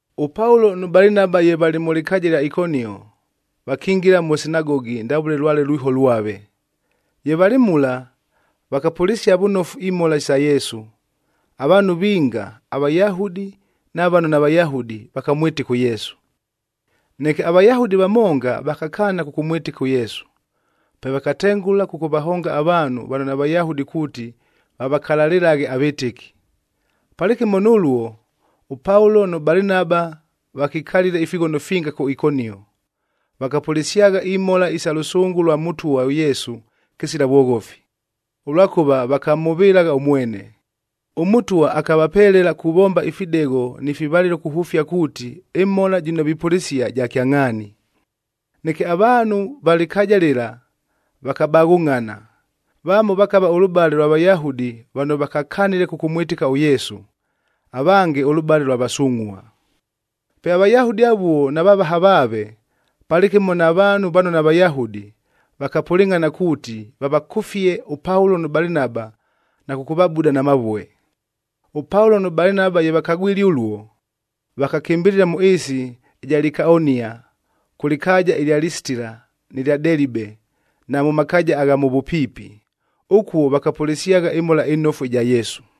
ɄPaulo nʉ Balinaba ye valɨ mʉ lɨkaaja ɨlya Ikonio, vakingila mʉ sinagogi ndavʉle lwale lwiho lwave. Ye valɨ mula, vakapʉlɨsia vʉnofu imhola sa Yesu. Avaanhu vinga, aVayahudi na vano naVayahudi, vakamwɨtɨka ʉYesu. Neke aVayahudi vamonga vakakaana kʉkʉmwɨtɨka ʉYesu. Pe vakatengʉla kʉkʉvahonga avaanhu vano naVayahudi kuuti vavakalalɨlaghe avɨtɨki. Palɨkɨmo nʉluo, ʉPaulo nʉ Balinaba vakikalile ifighono finga kʉ Ikonio, vakapʉlɨsyagha imhola isa lʉsʉngʉ lwa Mʉtwa ʉYesu kɨsila vwoghofi, ʉlwakʉva vakamhʉvɨlagha ʉmwene. ɄMʉtwa akavapelela kuvomba ifidegho ni fivalɨlo kuhʉfia kuuti, ɨmhola jɨno vipʉlɨsia ja kyangʼhaani. Neke avaanhu va lɨkaaja lɨla vakabaghʉngʼhana, vamo vakava ʉlʉbale ʉlwa Vayahudi vano vakakanile kʉkʉmwɨtɨka ʉYesu, avange ʉlʉbale ʉlwa vasungʼhua. Pe aVayahudi avuo na vavaha vaave, palɨkɨmo na vaanhu vano naVayahudi, vakapʉlɨngʼhana kuuti, vavakʉfie ʉPaulo nʉ Balinaba na kʉkʉvabuda na mavue. ɄPaulo nʉ Balinaba ye vakagwile ʉluo, vakakɨmbɨlɨla mʉ ɨɨsi ɨja Likaonia, kʉ lɨkaaja ɨlya Lisitila nɨ lya Delibe na mʉ makaaja agha mʉ vʉpiipi. Ʉkuo vakapʉlɨsyagha ɨMhola ɨNofu ɨja Yesu.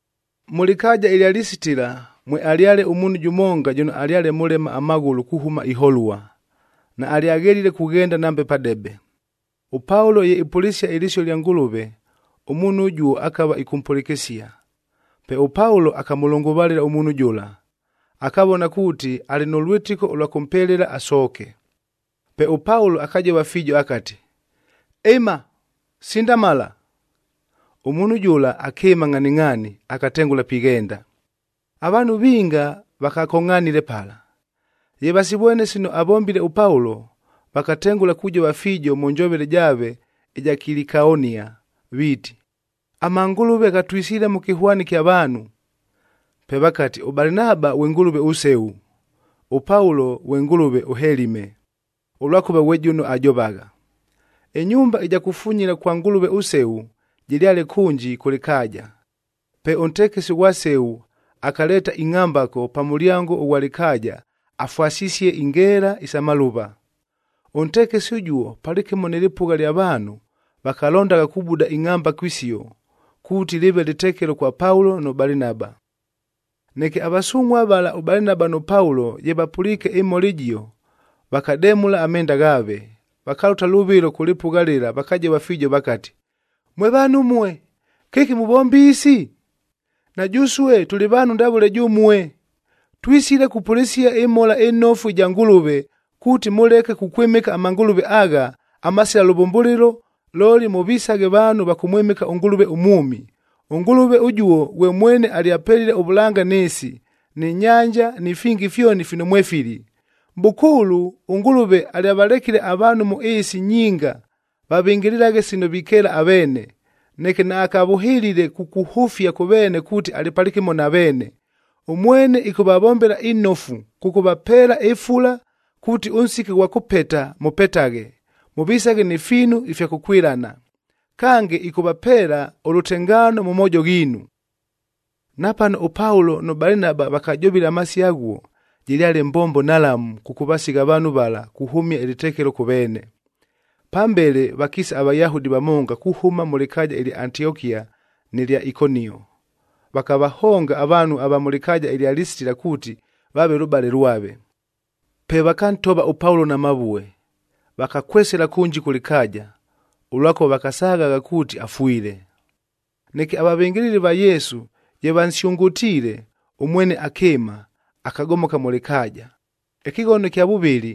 Mʉ lɨkaaja ɨlya Lisitila mwealyale ʉmuunhu jʉmonga jʉno alyale mʉlema amaghʉlʉ kuhʉma iholua, naalyaghelile kughenda nambe padebe. ɄPaulo ye ipʉlɨsia ɨlɨsio lya Ngʉlʉve, ʉmuunhu ʉjuo akava ɨkʉmpʉlɨkɨsia. Pe ʉPaulo akamʉlʉngʉvalɨla ʉmuunhu jʉla, akavona kuuti, alɨ nʉ lwɨtɨko ʉlwa kʉmpelela asooke. Pe ʉPaulo akajova fiijo akati, “Ɨma, sindamala!” Ʉmuunhu jʉla akɨɨma ngʼhaningʼhaani, akatengʉla pighenda. Avaanhu vinga vakakongʼhanile pala. Ye vasivwene sino avombile ʉPaulo, vakatengʉla kujova fiijo mʉ njovele jaave ɨja Kilikaonia viiti, “Amangʉlʉve ghatwisile mʉ kɨhwani kya vaanhu!” Pe vakati, ʉBalinaba ghwe ngʉlʉve ʉSeu, ʉPaulo ghwe ngʉlʉve ʉHelime,a ʉlwakʉva ghwe jʉno ajovagha. Ɨnyumba ɨja kufunyila kwa ngʉlʉve ʉSeu, jɨlyale kʉnji kʉ lɨkaaja. Pe ʉntekesi ʉghwa Seu akaleeta ingʼhambako pa mʉlyango ʉghwa lɨkaaja afwasisie ingeela isa malʉva. Ʉntekesi ʉjuo palɨkɨmo nɨ lɨpʉgha lya vaanhu vakalondagha kubuda ingʼhambako isio, kuuti lɨɨve lɨtekelo kwa Paulo nʉ Balinaba. Neke avasungʼhuab vala ʉBalinaba nʉ Paulo ye vapʉliike ɨmhola ɨjio, vakademʉla amenda ghaave,c vakalʉta lʉvɨlo kʉ lɨpʉgha lɨla vakajova fiijo vakati, “Mwe vaanhu ʉmue, kɨki muvomba isi? Na jʉsue tʉlɨ vaanhu ndavʉle jʉmue! Twisile kupʉlɨsia ɨMhola ɨNofu ɨja Ngʉlʉve, kuuti mʉleke kukwɨmɨka amangʉlʉve agha, amasila lʉvʉmbʉlɨlo, looli mʉvisaghe vaanhu va kʉmwɨmɨka ʉNgʉlʉve ʉmwʉmi. ɄNgʉlʉve ʉjuo ghwe mwene alyapelile ʉvʉlanga nɨ ɨɨsi, nɨ nyanja ni fingi fyoni fino mwefili. Mʼbʉkʉʉlʉ ʉNgʉlʉve alyavalekile avaanhu mʉ ɨɨsi nyinga vavɨngɨlɨlaghe sino vikeela aveene. Neke naakavʉhɨlile kukuhʉfia kʉ veene kuuti alɨ palɨkɨmo na veene. Ʉmwene ɨkʉvavombela inofu kʉkʉvapeela ɨfula kuuti ʉnsiki ʉghwa kʉpeta, mʉpetaghe, mʉvisaghe ni fiinu ifya kʉkwɨlana. Kange, ɨkʉvapeela ʉlʉtengaano mʉ moojo ghiinu.” Napano ʉPaulo nʉ Balinaba vakajovile amasio aghuo, jɨlyale mbombo nhalamu kʉkʉvasigha avaanhu vala kuhʉmia ɨlɨtekelo kʉ veene. Pambele vakiisa aVayahudi vamonga kuhʉma mʉ lɨkaaja ɨlya Antiokia nɨ lya Ikonio, vakavahonga avaanhu ava mʉ lɨkaaja lya Lisitila kuuti vaave lʉbale lwave. Pe vakantova ʉPaulo na mavue, vakakwesela kʉnji kʉ lɨkaaja, ʉlwakʉva vakasaghagha kuuti afwile. Neke avavɨngɨlɨli va Yesu ye vansyʉngʉtiile, ʉmwene akɨɨma, akagomoka mʉ lɨkaaja. Ɨkɨghono ɨkya vʉvɨlɨ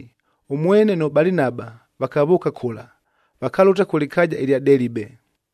ʉmwene nʉ Balinaba vakavʉʉka kʉla, vakalʉta kʉ lɨkaaja ɨlya Delibe.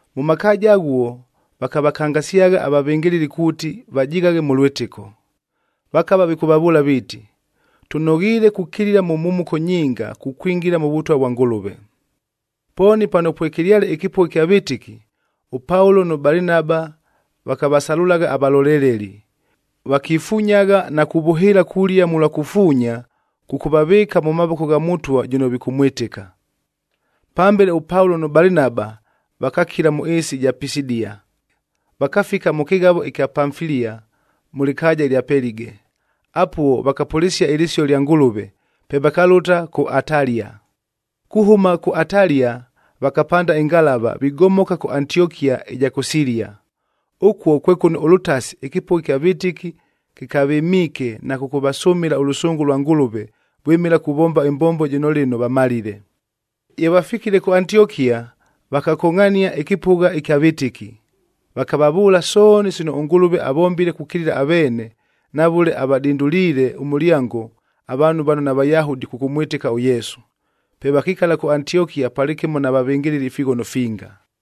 Mʉ makaaja aghuo vakavakangasyagha avavɨngɨlɨli kuuti vajighaghe mʉ lwɨtɨko. Vakava vikʉvavʉʉla viiti, “Tʉnoghiile kukilila mʉ mhumuko nyinga kukwingila mʉ Vʉtwa vwa Ngʉlʉve.” Pooni pano pwekɨlyale ɨkɨpʉgha ɨkya vɨtɨki, ʉPaulo nʉ Balinaba vakavasalʉlagha avaloleleli. Vakifunyagha na kuvʉhɨɨla kulia mʉlwa kufuunya kʉkʉvavɨɨka mʉ mavoko gha Mʉtwa jʉno vikʉmwɨtɨka. Pambele ʉPaulo nʉ Balinaba vakakila mʉ ɨɨsi ɨja Pisidia, vakafika mʉ kɨghavo ɨkya Pamfilia, mʉ lɨkaaja ɨlya Pelige. Apuo vakapʉlɨsia ɨlɨsio lya Ngʉlʉve, pe vakalʉta kʉ Atalia. Kuhʉma kʉ Atalia vakapanda ɨngalava vigomoka kʉ Antiokia ɨja kʉ Silia. Ʉkuo kwe kʉno ʉlʉtasi ɨkɨpʉgha ɨkya vɨtɨki kɨkavɨmiike na kʉkʉvasʉmɨla ʉlʉsʉngʉ lwa Ngʉlʉve vwɨmɨla kuvomba ɨmbombo jɨno lɨno vamalile. Ye vafikile kʉ Antiokia, vakakongʼhania ɨkɨpʉgha ɨkya vɨtɨki, vakavavʉʉla sooni sino ʉNgʉlʉve avombile kukilila aveene na vʉle avadinduliile ʉmʉlyango avaanhu vano naVayahudi kʉkʉmwɨtɨka ʉYesu. Pe vakikala kʉ Antiokia palɨkɨmo na vavɨngɨlɨli ifighono finga.